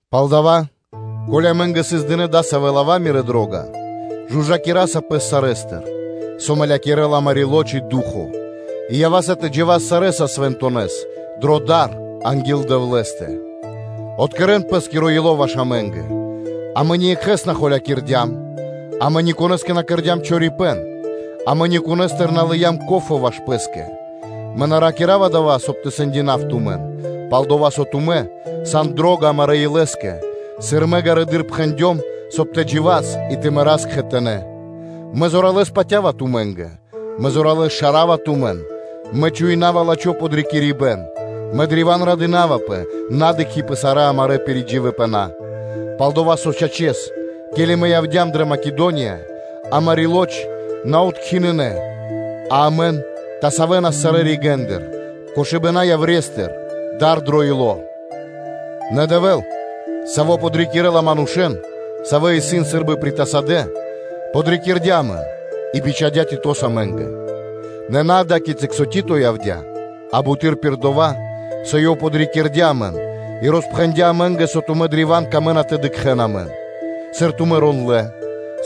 Палдава́, ко́ли амэ́нгэ сыс дынэ́ дасавэ́ лава́, мирэ́ дро́га, жужакираса пэс сарэ́стыр, со мэлякирэла амари́ лоч (плоть) и ду́хо (фа́но) и ява́са тэ джива́с сарэ́са свэнтонэс дро дар анги́л Дэвлэ́стэ. Откэрэн пэ́скиро ило́ ваш амэ́нгэ: амэ ниекхэ́с на холякирдям, амэ никонэ́скэ на кэрдя́м чорипэ́н, амэ никонэстыр на лыям ко́фо (процэнто) ваш пэ́скэ. Мэ на ракира́ва дава́, соб (кай) тэ сэндинав тумэн; пал-дова́ со тумэ́ сан дро́га амарэ́ илэскэ, сыр мэ ґарэдыр пхэндём, соб (кай) тэ джива́с и тэ мэрас кхэтанэ́. Мэ зоралэ́с патя́ва тумэ́нгэ; мэ зоралэ́с шарава тумэн; мэ чуинава лачхо́ подрикирибэ́н; мэ древа́н радынавпэ, на дыкхи́ пэ сарэ́ амарэ́ пиридживипэна. Пал-дова́ со, чачэс, ке́ли амэ явдя́м дрэ Македония, амари́ лоч (маса́) на откхиныя, а амэн тасавэнас сарэ́ ригэ́ндыр: чингарда́ яврестыр, дар дро ило́ андра́л. Нэ Дэвэ́л, Саво́ подрикирэ́ла манушэ́н, савэ́ исын сы́рбы притасадэ, подрикирдя амэн и бичхадя́ Титос амэ́нгэ; нэ на ада́кицы, со Тито явдя́, а буты́р пир дова́, со ёв подрикирдя амэн и роспхэндя́ амэ́нгэ, со тумэ́ древа́н камэ́на тэ дыкхэ́н амэн; сыр тумэ́ рондлэ́,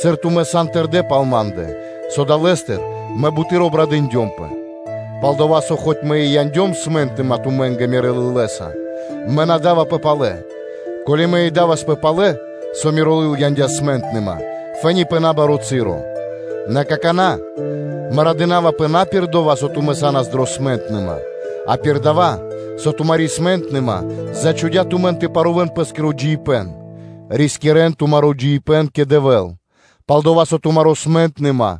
сыр тумэ́ сан тэрдэ́ пал ма́ндэ, со далэ́стыр мэ буты́р обрадындёмпэ. Пал-дова́ со мэ хоць и яндём смэнтныма (печаль) тумэ́нгэ мирэ́ лылэса, мэ на́ да́вапэ палэ; ко́ли мэ и да́васпэ палэ, со миро лыл яндя́ смэнтныма, фэ́ни (то́ка) пэ набаро́ часо. Нэ какана́ мэ радынавапэ на пир дова́, со тумэ́ са́нас дрэ смэнтныма, а пир дава́, со тумари́ смэнтныма зачхудя тумэн тэ парувэн пэ́скиро джиибэ́н (тэ рискирэ́н тумаро́ джиибэ́н кэ Дэвэ́л), пал-дова́ со тумари́ смэнтныма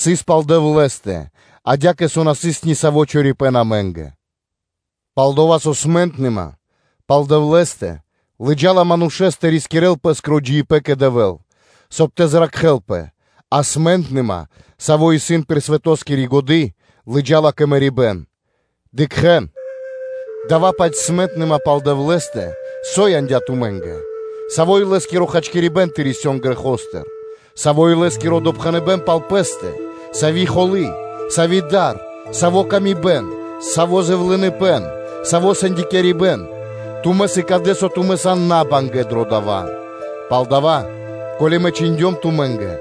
сыс пал Дэвлэ́стэ, адя́кэ со на сыс ни саво́ чорипэ́н амэ́нгэ. Пал-дова́ со смэ́нтныма (ту́га) пал Дэвлэ́стэ лыджа́ла манушэ́с, соб (кай) ёв тэ зракхэлпэ, а смэнтныма, сави́ исын пир годы́ дро дава́ свэ́то, лыджа́ла кэ мэрибэ́н. Дыкхэ́н! Дая́-паць смэнтныма пал Дэвлэ́стэ, – со яндя́ тумэ́нгэ? Саво́ илэ́скиро хачкирибэ́н тэ рисён грэхостыр! Саво́ илэ́скиро допхэныбэ́н пал пэ́стэ! Сави́ холы́! Сави́ дар! Сави́ ла́ска илэ́стыр! Саво́ зэвлыныпэ́н! Саво́ сэндякирибэн! Тумэ́ сыкадэ, со тумэ́ сан набангэ дро дава́. Палдава́, ко́ли мэ чхиндём тумэ́нгэ,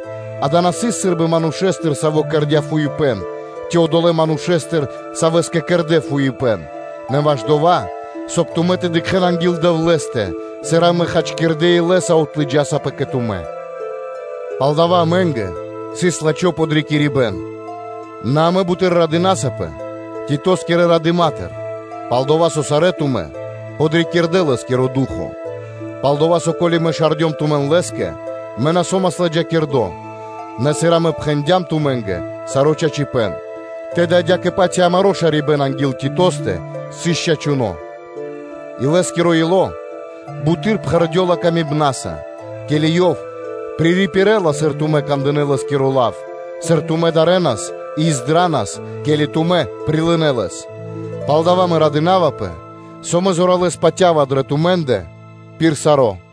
дава́ на сыс сы́рбы манушэ́стыр, саво́ кэрдя́ биба́хт, ци одолэ́ манушэ́стыр, савэ́скэ кэрдэ́ биба́хт; нэ ваш дова́, соб (кай) тумэ́ тэ дыкхэ́н анги́л Дэвлэ́стэ, сыр амэ хачкирдэ́ илэ́са отлыджасапэ кэ тумэ́. Пал дава́ амэ́нгэ сыс лачхо́ подрикирибэ́н. Нэ амэ буты́р радынасапэ Титоскирэ радыма́тыр, пал-дова́ со сарэ́ тумэ́ подрикирдэ лэ́скиро ду́хо (фа́но). Пал-дова́ со ко́ли мэ шардём тумэн лэ́скэ, мэ на со́мас ладжакирдо́, нэ, сыр амэ пхэндям тумэ́нгэ саро́ чачипэ́н, тэды адя́кэ-паць и амаро́ шарибэ́н анги́л Титостэ сыс чачуно́: и лэ́скиро ило́ буты́р пхэрдёла ласкаса, ке́ли ёв пририпирэла, сыр тумэ́ кандынэ́ лэ́скиро лав, сыр тумэ́ дарэнас и издранас, ке́ли тумэ́ прилынэ́ лэс. Палдава́ мэ радынавпэ, со мэ зоралэ́с патя́ва дрэ тумэ́ндэ пир саро́.